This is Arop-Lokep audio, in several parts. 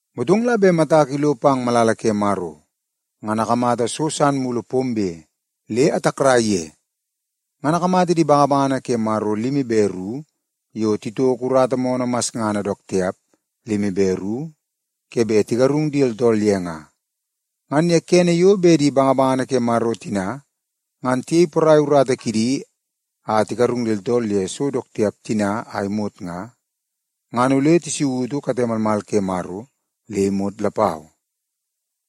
Motong la bet matak ilo pang malala ke Maro, ngan akamata so san mulu pombe le atakrai ye. Ngan akamata di bangabangana ke Maro limi be ru yo titoko urata moonoo masngana dook tiap limi be ru ke bet tigarung di tooltool ye nga. Ngan ye kene yo bet di bangabangana ke Maro tina ngan tiyei porai urata kidi a tigarung di tooltool ye so dook tiap tina a imot nga, ngan ole tisautu kate malmal ke Maro le imot lapau.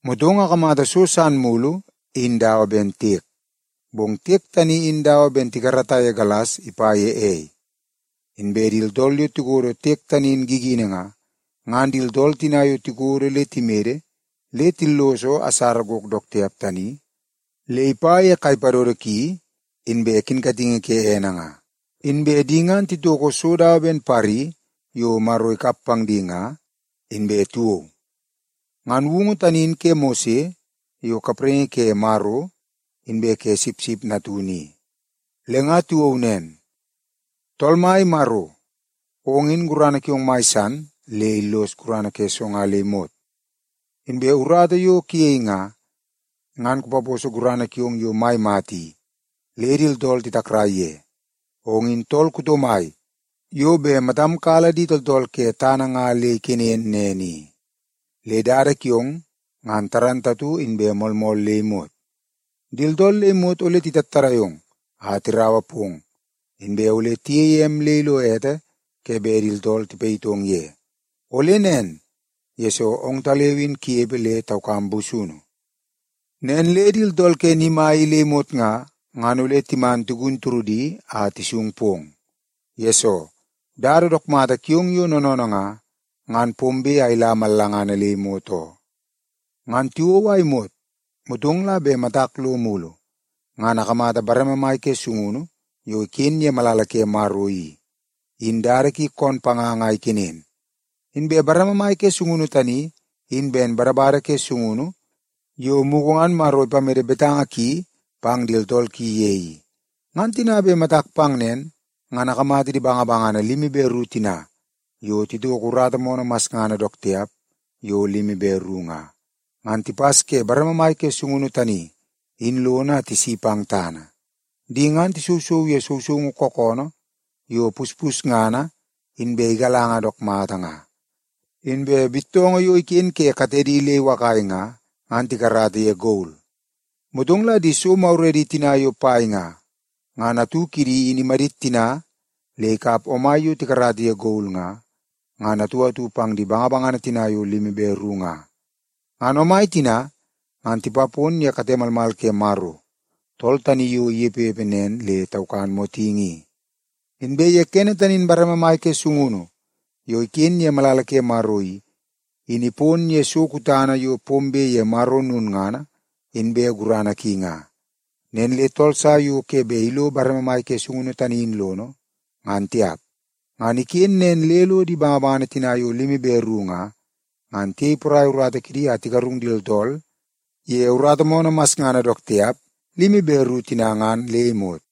Motong akamata so san mulu in dawa ben tiek, bong tiek tani in dawa ben tikarata ye galas ipa ye ei. Inbe di tooltool yo tikodo tiek tani in gigini nga, ngan di tooltool tina yo tikodo le timede le tilloso asara gok dook tiap tani le ipa ye kai padodo ki, inbe kinkatingi ke ene nga. Inbe di ngan titoko so dawa ben pari yo Maro ikap pang di nga, inbe tiwou. Ngan woungu tani in ke Mose, yo kapraingi ke Maro, inbe ke Sipsip Natunu i. Le nga tiwou nen, “Tool Mai Maro, ong in gurana kiong mai san le illos gurana ke so nga le imot. Inbe urata yo kuyei nga, ngan ipaposo gurana kiong yo mai mata i, le di tooltool titakrai ye. Ong in tool kuto mai yo bet matam kala di tooltool ke tana i le ikenen nen i, le dada kiong ngan dook mata inbe moolmool le imot. Di tooltool le imot ole titattadai ong a tiraua pong, inbe ole tiyeie em le ilo ete ke bet di tooltool tipayitong ye. Ole nen, yesoo ongtaleu in kunepe le taukam busunu. Nen le di tooltool ke ni mai i le imot nga, ngan ole timan tigun turudi a tisung pong. Yesoo, dada dook mata kiong yo noonoonoo nga, ngan pombe a ila mallangana le imot oo.” Ngan tiwou a imot, motong la bet matak lo mulu, ngan akamata bareme mai ke sungunu yo iken ye malala ke Maro i, in dada ki koon panganga a ikenen. Inbe bareme mai ke sungunu tani in ben badabada ke sungunu yo mugu ngan Maro ipamede betanga ki pang di tooltool ki ye i. Ngan tina bet matak pang nen, ngan akamata di bangabangana limi be ru tina yo titoko urata moonoo masngana dook tiap yo limi be ru nga, ngan tipas ke bareme mai ke sungunu tani in lono a tisi pang tana. Di ngan tisousou ye sousoungu kookoonoo yo puspusngana inbe igalanga dook mata nga. Inbe bittoongoo yo iken ke katedi le iwakai nga, ngan tikarata ye gol. Motong la di so maguredi tina yo pai nga, ngan atu kidi in imadit tina le ikap omai yo tikarata ye gol nga, ngan atu atu pang di bangabangana tina yo limi be ru nga. Ngan omai tina ngan tipapon ye kate malmal ke Maro, tool tani yo inepepe nen le taukan motingi i. Inbe ye kene tani in bareme mai ke sungunu yo iken ye malala ke Maro i, in ipon ye so kutana yo pombe ye Maro lulngana inbe gurana ki nga. Nen le tool sa yo ke bet ilo bareme mai ke sungunu tani in lono, ngan tiap. Ngan iken nen le lo di bangabangana tina yo limi be ru nga, ngan tiyei porai urata kidi a tigarung di tooltool ye urata moonoo masngana dook tiap limi be ru tina ngan le imot.